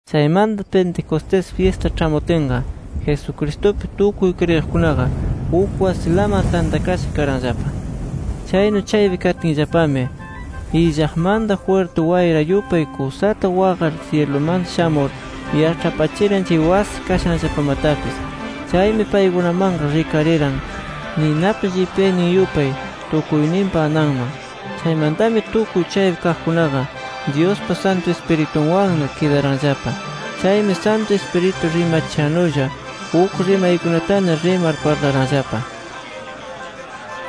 Chaymanta Pentecostés fyista ĉhamutinqa, Jesucristupi tukuy kriyiqkunaqa uk wasilaman tantakasha karanllapa. Chaynu chaypi katinllapami, illaqmanta jwirti wayra yupay kusata waqar syilumanta shamur, yaĉhapachiran chay wasi kashanllapamatapis. Chaymi, paykunamanqa rikariran ninapa llipyaynin yupay tukuyninpa ananman. Chaymantami, tukuy chaypi kaqkunaqa Dyuspa Santu Ispiritunwanna kidaranllapa. Chaymi Santu Ispiritu rimachishannulla uk rimaykunatana rimar parlaranllapa.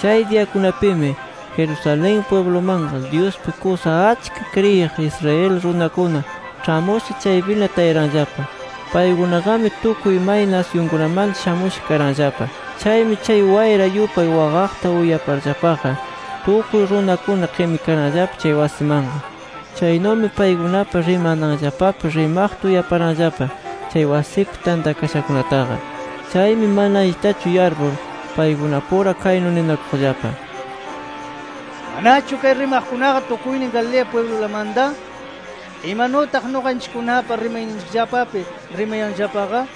Chay diyakunapimi Jerusalén pwiblumanqa, Dyuspi kusa achka kriyiq Israel runakuna ĉhamusha chaypina tayaranllapa. Paykunaqami tukuy may nasyunkunamanta shamusha karanllapa. Chaymi, chay wayra yupay waqaqta uyaparllapaqa, tukuy runakuna qimikaranllapa chay wasimanqa. Chaynumi paykunapa rimananllapapi rimaqta uyaparanllapa, chay wasipi tantakashakunataqa. Chaymi mana allitachu yarpur, paykunapura kaynu ninakuqllapa: “¿Manachu kay rimaqkunaqa tukuynin, Galilea pwiblulamanta? ¿Imanutaq nuqanchikkunapa rimayninchikllapapi rimayanllapaqa?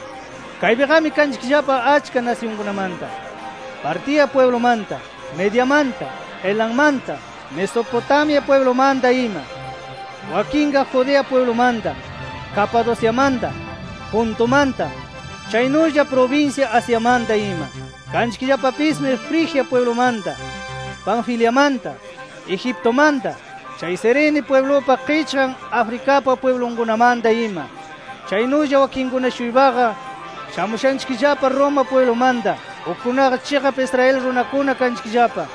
Kaypiqami kanchikllapa achka nasyunkunamanta: Partia pwiblumanta, Mediamanta, Elammanta, Mesopotamia pwiblumanta ima. Wakinqa Judea pwiblumanta, Capadociamanta, Pontumanta, chaynulla prubinsya Asiamanta ima. Kanchikllapapismi Frigia pwiblumanta, Panfiliamanta, Egiptumanta, chay Cirene pwiblupa qichqan Africapa pwiblunkunamanta ima. Chaynulla wakinkuna-shuypaqa shamushanchikllapa Roma pwiblumanta. Ukkunaqa chiqap Israel runakuna kanchikllapa.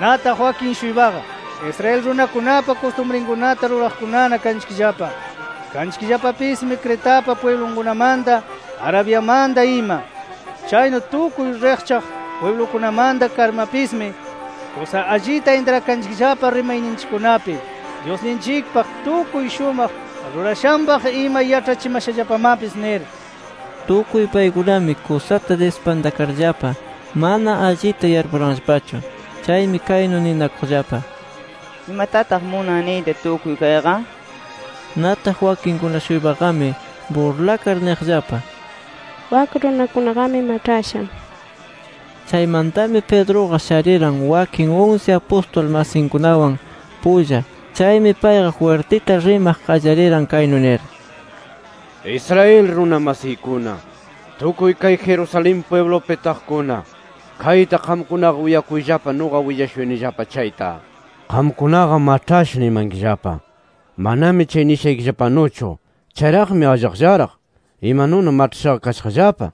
Nataq wakin-shuypaqa, Israel runakunapa kustumrikunata ruraqkunana kanchikllapa. Kanchikllapapismi Cretapa pwiblunkunamanta, Arabiamanta ima. Chaynu tukuy riqchaq pwiblukunamanta karmapismi, kusa allita intrakanchikllapa rimayninchikkunapi Dyusninchikpaq, tukuy shumaq rurashanpaq ima yaĉhachimashallapamapis nir”. Tukuy paykunami kusata dispantakarllapa, mana allita yarpuranllapachu. Chaymi kaynu ninakuqllapa: “¿Imatataq munan niyta, tukuy kayqa?” nir. Nataq wakinkuna-shuypaqami burlakar, niqllapa: “Wak runakunaqami maĉhasha” nir. Chaymantami Pedruqa shariran, wakin unsi apustul masinkunawan pulla. Chaymi payqa jwirtita rimaq qallariran, kaynu nir: “Israel runa masiykuna, tukuy kay Jerusalén pwiblupi taqkuna, kayta qamkunaqa uyakuyllapa nuqa willashuyanillapa chayta. Qamkunaqa maĉhasha nimankillapa. Manami chay nishaykillapanuchu. Chayraqmi allaqllaraq, imanuna maĉhashaqa kashaqllapa.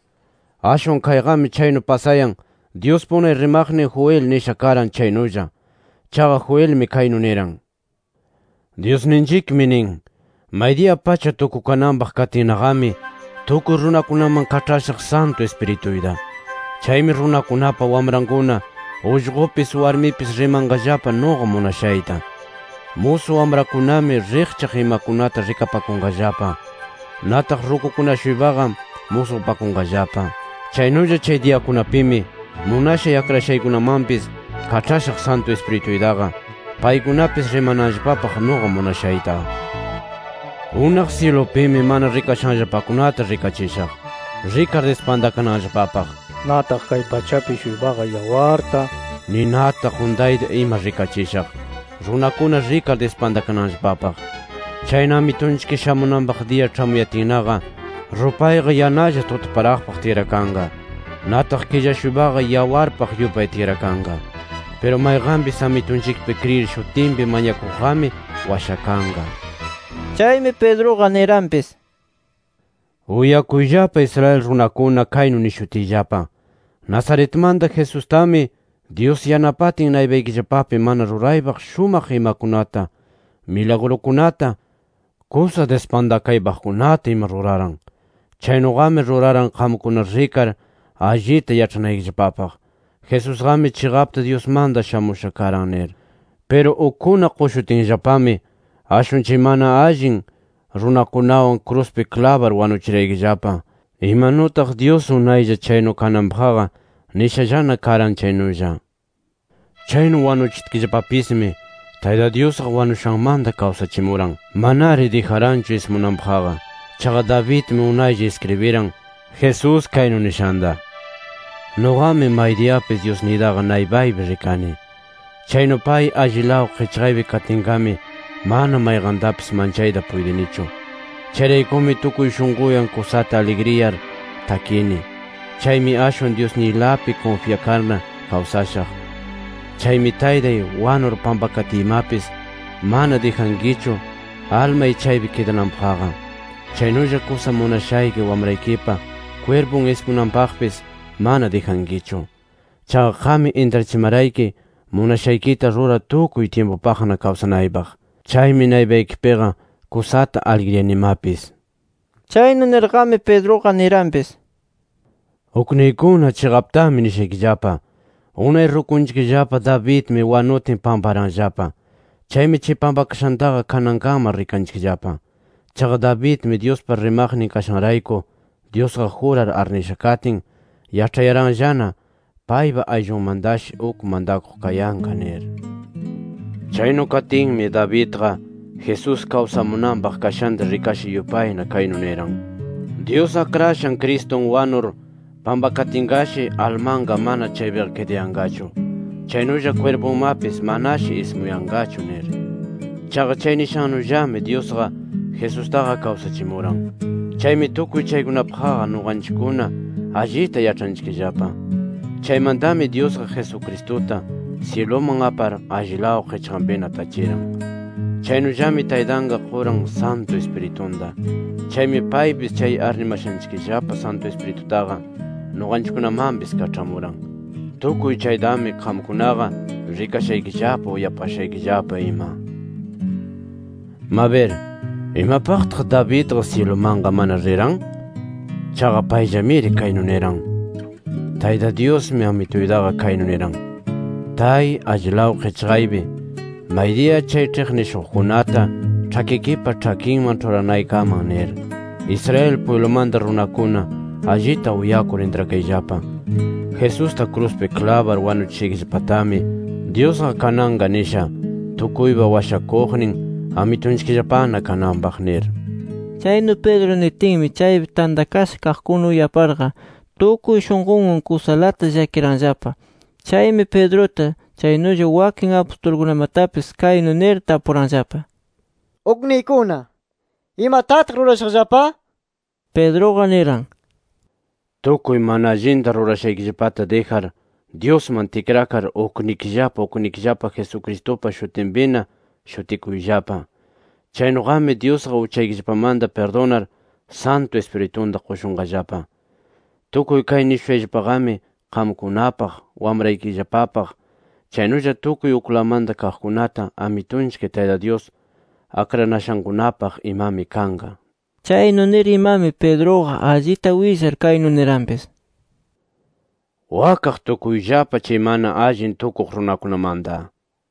Ashwan kayqami chaynu pasayan, Dyuspa unay rimaqnin Joel nisha karan chaynulla. Chaqa Joelmi kaynu niran: ‘Dyusninchikmi nin: Maydiya pacha tukukananpaq katinnaqami tukuy runakunaman kaĉhashaq Santu Ispirituyta. Chaymi runakunapa wamrankuna, ullqupis, warmipis rimanqallapa nuqa munashayta. Musu wamrakunami riqchaq imakunata rikapakunqallapa. Nataq rukukuna-shuypaqa musqupanqallapa. Chaynulla chay diyakunapimi munashay akrashaykunamanpis kaĉhashaq Santu Ispirituytaqa, paykunapis rimananllapapaq nuqa munashayta. Unaq syilupimi mana rikashanllapakunata rikachishaq, rikar dispantakananllapapaq. Nataq kay pachapi-shuypaqa yawarta, ninata, quntayta ima rikachishaq, runakuna rikar dispantakananllapapaq. Chayna, Amitunchik shamunanpaq diya ĉhamuyatinnaqa, rupayqa yanalla tutaparaqpaq tikrakanqa. Nataq killa-shuypaqa yawarpaq yupay tikrakanqa. Piru mayqanpis Amitunchikpi kriyir shutinpi mañakuqqami washakanqa’ nir”. Chaymi Pedruqa niranpis: “Uyakuyllapa, Israel runakuna, kaynu nishutiyllapa: Nazaretmanta Jesustami, Dyus yanapatin naypaykillapapi mana ruraypaq shumaq imakunata, milagrukunata, kusa dispantakaypaqkunata ima ruraran. Chaynuqami ruraran qamkuna rikar allita yaĉhanaykillapapaq, Jesusqami chiqapta Dyusmanta shamusha karan nir. Piru ukkuna qushutinllapami ashwan chay mana allin runakunawan kruspi klabar wanuchiraykillapa, imanutaq Dyus unaylla chaynu kananpaqqa nishallana karan chaynulla. Chaynu wanuchitkillapapismi, Tayta Dyusqa wanushanmanta kawsachimuran. Manari dijaranchu ismunanpaqqa. Chaqa Davidmi unaylla iskribiran, Jesús kaynu nishanta: ‘Nuqami maydiyapis Dyusniytaqa naypaypi rikani. Chaynu pay allilaw qichqaypi katinqami, mana mayqantapis manchayta puytinichu. Chayraykumi tukuy shunquywan kusata aligriyar takini. Chaymi ashwan Dyusniylapi kunfyakarna kawsashaq. Chaymi Taytay, wanur pampakatiymapis mana dijankichu almay chaypi kidananpaqqa. Chaynulla kusa munashayki Wamraykipa kwirpun ismunanpaqpis mana dijankichu. Chaqa qammi intrachimarayki, munashaykita rurar tukuy tyimpupaqna kawsanaypaq. Chaymi naypaykipiqa, kusata aligriyanimapis’ nir”. Chaynu nirnaqami Pedruqa niranpis: “Ukniykuna, chiqaptami nishaykillapa: Unay rukunchikllapa Davidmi wanutin, pamparanllapa. Chaymi chay pampakashantaqa kanankaman rikanchikllapa. Chaqa Davidmi Dyuspa rimaqnin kashanrayku Dyusqa jurar arnisha katin, yaĉhayaranllana, paypa ayllunmantashi uk mantakuq kayanqa nir. Chaynu katinmi Davidqa, Jesús kawsamunanpaq kashanta rikasha yupayna kaynu niran: Dyus Akrashan Cristun wanur pampakatinqashi, almanqa mana chaypiqa kidayanqachu, chaynulla kwirpunmapis manashi ismuyanqachu nir. Chaqa chay nishannullami Dyusqa, Jesustaqa kawsachimuran. Chaymi tukuy chaykunapaqqa nuqanchikkuna allita yaĉhanchikllapa. Chaymantami Dyusqa, Jesucristuta syiluman apar, allilaw qichqanpina tachiran. Chaynullami Taytanqa quran Santu Ispiritunta. Chaymi paypis chay arnimashanchikllapa Santu Ispiritutaqa nuqanchikkunamanpis kaĉhamuran. Tukuy chaytami qamkunaqa rikashaykillapa, uyapashaykillapa ima. Mabir, ¿imapaqtaq Davidqa syilumanqa mana riran? Chaqa payllamiri kaynu niran: ‘Tayta Dyusmi, Amituytaqa kaynu niran: Tay allilaw qichqaypi, maydiya chay ĉhiqnishuqkunata ĉhakikipa ĉhakinman ĉhuranaykaman nir’. “Israel pwiblumanta runakuna allita uyakur intrakayllapa, Jesusta kruspi klabar wanuchishaykillapatami, Dyusqa kananqa nisha, tukuypa Washakuqnin Amitunchikllapana kananpaq” nir. Chaynu Pedro nitinmi, chaypi tantakasha kaqkuna uyaparqa, tukuy shunqunwan kusalata llakiranllapa. Chaymi Pedruta, chaynulla wakin apustulkunamatapis kaynu nir tapuranllapa: —¡Ukniykuna! ¿Imatataq rurashaqllapa? nir. Pedruqa niran: —Tukuy mana allinta rurashaykillapata dijar, Dyusman tikrakar, uknikillapa uknikillapa Jesucristupa shutinpina shutikuyllapa. Chaynuqami Dyusqa uchaykillapamanta pirdunar, Santu Ispiritunta qushunqallapa. Tukuy kay nishushayllapaqami qamkunapaq, wamraykillapapaq, chaynulla tukuy uklawmanta kaqkunata Amitunchik Tayta Dyus akranashankunapaq imami kanqa nir. Chaynu nir imami, Pedruqa allita willar, kaynu niranpis: —¡Wakaq tukuyllapa chay mana allin tukuq runakunamanta! nir.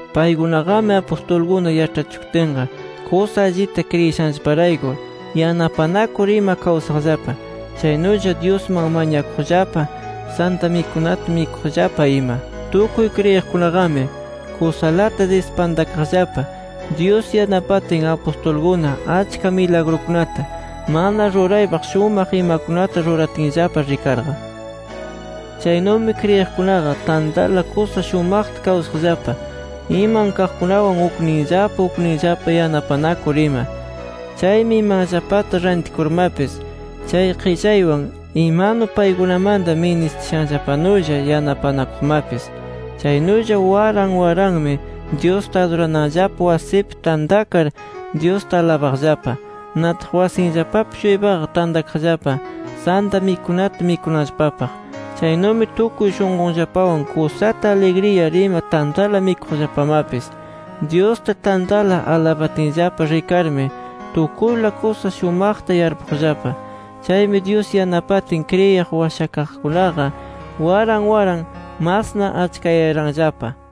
Paykunaqami apustulkuna yaĉhachikutinqa kusa allita kriyishanllaparayku yanapanakur ima kawsaqllapa. Chaynulla Dyusman mañakuqllapa; Santa Mikunata mikuqllapa ima. Tukuy kriyiqkunaqami kusalata dispantakaqllapa, Dyus yanapatin apustulkuna achka milagrukunata, mana ruraypaq shumaq imakunata ruratinllapa rikarqa. Chaynumi kriyiqkunaqa tantala kusa shumaqta kawsaqllapa, iman kaqkunawan ukninllapa ukninllapa yanapanakur ima. Chaymi imanllapata rantikurmapis chay qillaywan imanu paykunamanta ministishanllapanulla yanapanakuqmapis. Chaynulla waran waranmi Dyusta adurananllapa wasipi tantakar, Dyusta alabaqllapa. Nataq wasinllapapi-shuypaqa tantakaqllapa Santa Mikunata mikunanllapapaq. Chaynumi tukuy shunqunllapawan kusata aligriyar ima tantala mikuqllapamapis. Dyusta tantala alabatinllapa rikarmi, tukuyla kusa shumaqta yarpuqllapa. Chaymi Dyus yanapatin kriyir washakaqkunaqa waran waran masna achkayayaranllapa.